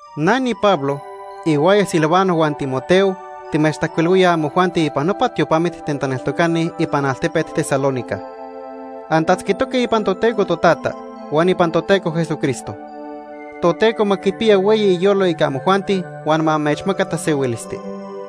Na niPablo, ihuaya Silvano huan Timoteo, timechtajcuilhuíaj amojuanti ipan nopa tiopamit ten taneltocani ipan altepet Tesalónica. Antatzquitoque ipan Toteco Totata huan ipan Toteco Jesucristo. Toteco ma quipiya hueyi iyolo ica amojuanti huan ma amechmaca tasehuilisti.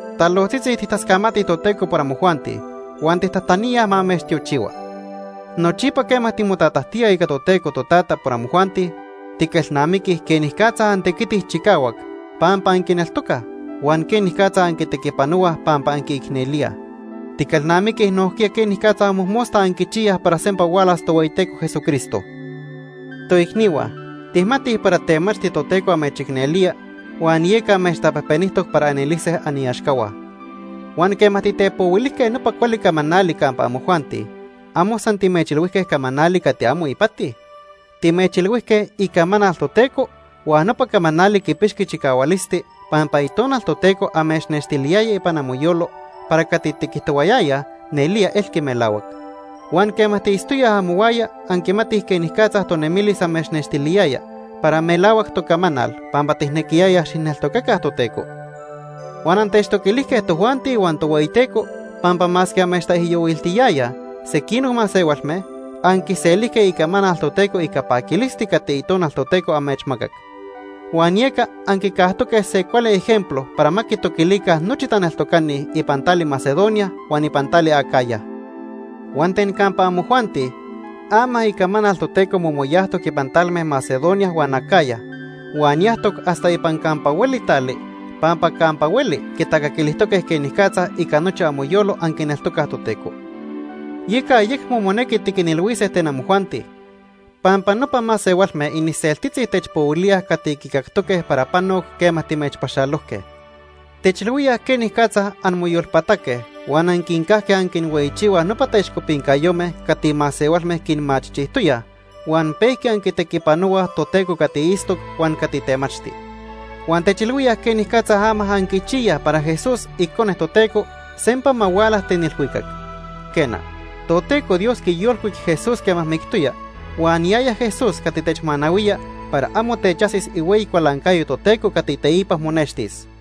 Talojtzitzi tijtascamatij Toteco por amojuanti huan tijtajtaníaj ma amechtiochihua. Nochipa quema timotatajtíaj ica Toteco Totata por amojuanti, tiquelnamiquij quenicatza antequitij chicahuac pampa anquineltocaj, huan quenicatza anquitequipanohuaj pampa anquiicnelíaj. Tiquelnamiquij nojquiya quenicatza mojmosta anquichiyaj para sempa hualas Tohueyiteco Jesucristo. Toicnihua, tijmatij para temachti Toteco amechicnelía huan amechtapejpenijtoc para anelise aniaxcahua. Huan quema titepohuilijque nopa cuali camanali campa amojuanti, amo san timechilhuijque camanali cati amo ipati. Timechilhuijque icamanal Toteco huan nopa camanali quipixqui chicahualisti pampa Itonal Toteco amechnextiliyaya ipan amoyolo para cati tiquijtohuayayaj nelía elqui melahuac. Huan quema tiitztoyaj amohuaya anquimatij quenicatza tonemilis amechnextiliyaya para melahuac tocamanal pampa tijnequiyayaj xijneltocaca Toteco. Huan anquitoquilijque tojuanti huan Tohueyiteco, pampa masque amechtaijyohuiltiyayaj sequinoc masehualme, anquiselijque icamanal Toteco ica paquilisti cati Itonal Toteco amechmacac. Huan yeca anquicajtoque se cuali ejemplo para ma quitoquilica nochi taneltocani ipan tali Macedonia huan ipan tali Acaya. Huan ten campa amojuanti, ama icamanal Toteco momoyajtoc ipan talme Macedonia huan Acaya, huan yajtoc hasta ipan campa hueli tali, pampa campa hueli quitacaquilijtoque quenicatza ica nochi amoyolo anquineltocaj Toteco. Yeca ayecmo monequi tiquinilhuise ten amojuanti, pampa nopa masehualme iniseltitzi techpohuilíaj cati quicactoque para panoc quema timechpaxalojque. Techilhuíaj quenicatza anmoyolpataque huan anquincajque anquinhueyichihuaj nopa taixcopincayome cati masehualme quinmachijchijtoyaj, huan pejqui anquitequipanohuaj Toteco cati itztoc huan cati temachti. Huan techilhuíaj quenicatza ama anquichiyaj para Jesús, icone Toteco, sempa ma huala ten ilhuicac. Quena, Toteco Dios quiyolcuic Jesús quema mictoya, huan yaya Jesús cati techmanahuía para amo techajsis ihueyi cualancayo Toteco cati teipa monextis.